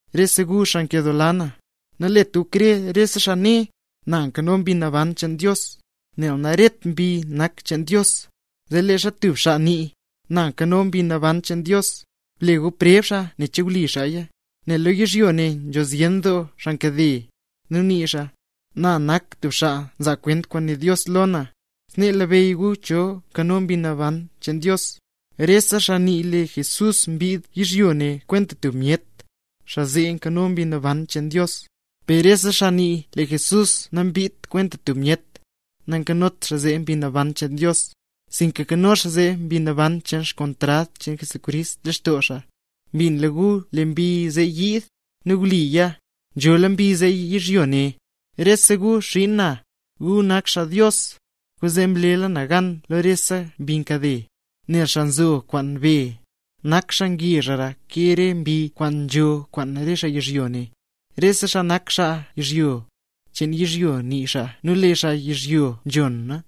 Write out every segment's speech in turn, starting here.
Rese gu xaa nkedoola na, nalet gu krer rese xaa né: “Lee Mbi Naban cheen Dios nzho lextoo na”, nel naret mbi nak cheen Dios. Zee leezha tub xaa nii: “Lee Mbi Naban cheen Dios nzho lextoo na”, ble gu preb xaa, ne che wli xaaya. Nel lo yizhyo ne nzho zyen doo xaa nkade, nu nii xaa: “Na nak tub xaa nzaa kwent kwaan né Dios lo na”. Snee labeyy gu cho nzho Mbi Naban cheen Dios lextoo: Rese xaa nii lee Jesús mbid yizhyo ne kwenta tub myet, xaa zee nzho Mbi Naban cheen Dios lextoo. Per rese xaa nii lee Jesús nambidt kwenta tub myet, nayot Mbi Naban cheen Dios lextoo xaa zee, sinka nzho mbi cheen kontrad cheen Jesucrist lextoo xaa. Mbinla gu lee mbi zee yiid; nu wliya, nzhola mbi zee yizhyo ne. Rese gu xiin na, gu nak xaa Dios. Kwaanzee mlela gu gan lo rese mbi nkade. Nel xaa nzo kwaan be, nak xaa ngezhra ke rese mbi kwaan nzo kwaan re xaa yizhyo ne. Rese xaa nak xaa yizhyo, cheen yizhyo nii xaa nu lee re xaa yizhyo nzhona.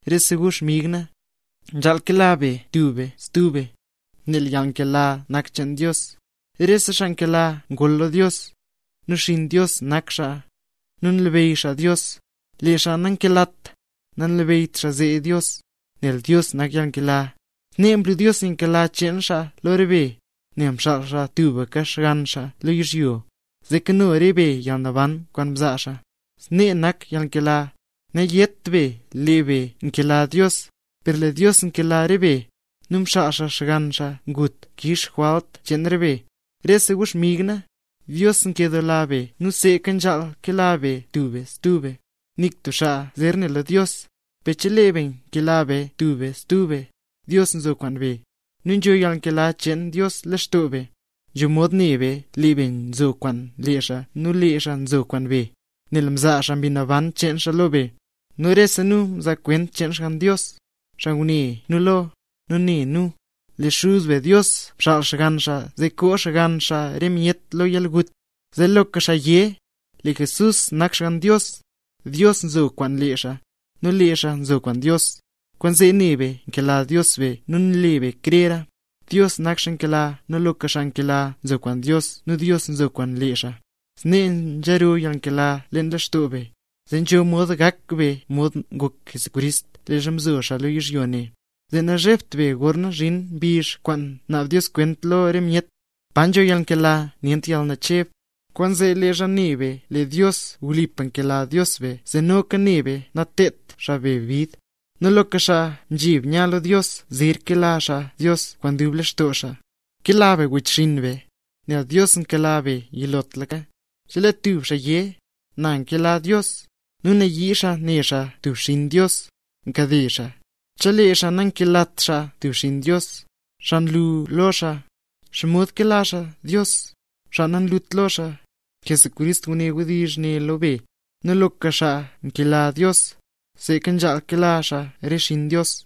Rese gu xmig na, nzhaal kela be tub be stub be, nel yalnkela nak cheen Dios. Rese xaa nkela ngol lo Dios, nu xinn Dios nak xaa, nu nlabeyy xaa Dios. Lee xaa nankelat, nanlabeyyt xaa zee Dios, nel Dios nak yalnkela. Snee mlu Dios yalnkela cheen xaa lo re be, nel mxaal xaa tubka Xgann xaa lo yizhyo, zee kano re be yalnaban kwaan nzaa xaa. Snee nak yalnkela: Nayét be lee be mkela Dios, per lee Dios mkela re be, nu mxaal xaa Xgann xaa gut, zee kix xaa re jwalt cheen re be. Rese gu xmig na, Dios nkedoola be nu seeka nzhaal kela be tub be stub be. Nik tub xaa zer ne lo Dios; per chelee be nkela be tub be stub be, Dios nzo kwaan be, nu nzho yalnkela cheen Dios leen lextoo be. Nzho mod ne be, lee be nzo kwaan lee xaa nu lee xaa nzo kwaan be, nel mzaa xaa Mbi Naban cheen xaa lo be. Nu rese nu nzaa kwent cheen Xgann Dios, xaa ngune nu lo, nu né nu: “Lee Xuz be Dios mxaal Xgann xaa zee koo Xgann xaa re myet yizhyo lo yalgut”. Zee loka xaa yé: “Lee Jesús nak Xgann Dios”, Dios nzo kwaan lee xaa, nu lee xaa nzo kwaan Dios. Kwaanzee ne be nkela Dios be nu nle be krera. Dios nak xaa nkela nu loka xaa nkela nzo kwaan Dios nu Dios nzo kwaan lee xaa. Snee nzhero yalnkela leen lextoo be, zee nzho mod gak be mod ngok Jesucrist leezha mzo xaa lo yizhyo ne, zee nazhebt be gorna zhin mbizh kwaan naab Dios kwent lo re myet. Pa nzho yalnkela nyent yalnacheb, kwaanzee leezha ne be lee Dios wlipa nkela Dios be zee noka ne be natedt xaa be bid. Nu loka xaa nzheb nya lo Dios zer kela xaa Dios kwaan dub lextoo xaa. Nkela be wechxinn be, nel Dios mkela be yilotlaka. Chelee tub xaa yé: “Na nkela Dios”, nu nayii xaa ne xaa tub xinn Dios, nkade xaa. Chelee xaa nankelat xaa tub xinn Dios, xaa nlu lo xaa, ¿xomod kela xaa Dios, xaa nanlut lo xaa? Jesucrist nguné wdizh ne lo be: Loka xaa nkela Dios, seeka nzhaal kela xaa re xinn Dios.